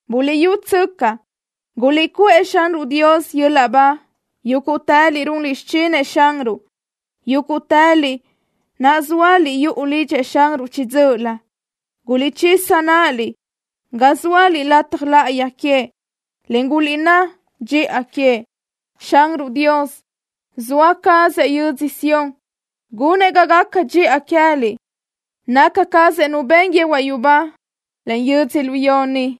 ¡Buliʼyútsöcaʼ! ¡Guliʼcuʼë Xanruʼ Dios yöl-laʼ ba, yúguʼtëliʼ runliʼ xichinëʼ Xanruʼ, yúguʼtëliʼ naʼ zóaliʼ yuʼu lidxëʼ Xanruʼ chiʼi dzö́ʼölö! ¡Guliʼchisa náʼaliʼ ga zóaliʼ lataj láʼayi queëʼ, en guliʼnná dxiʼa queëʼ! Xanruʼ Dios, zoa cazëʼ yödzö Sión, gunëʼ ga gaca dxiʼa queë́liʼ. Naca cazëʼ Nu ben yehuaʼ yubá, en yödzölió ni.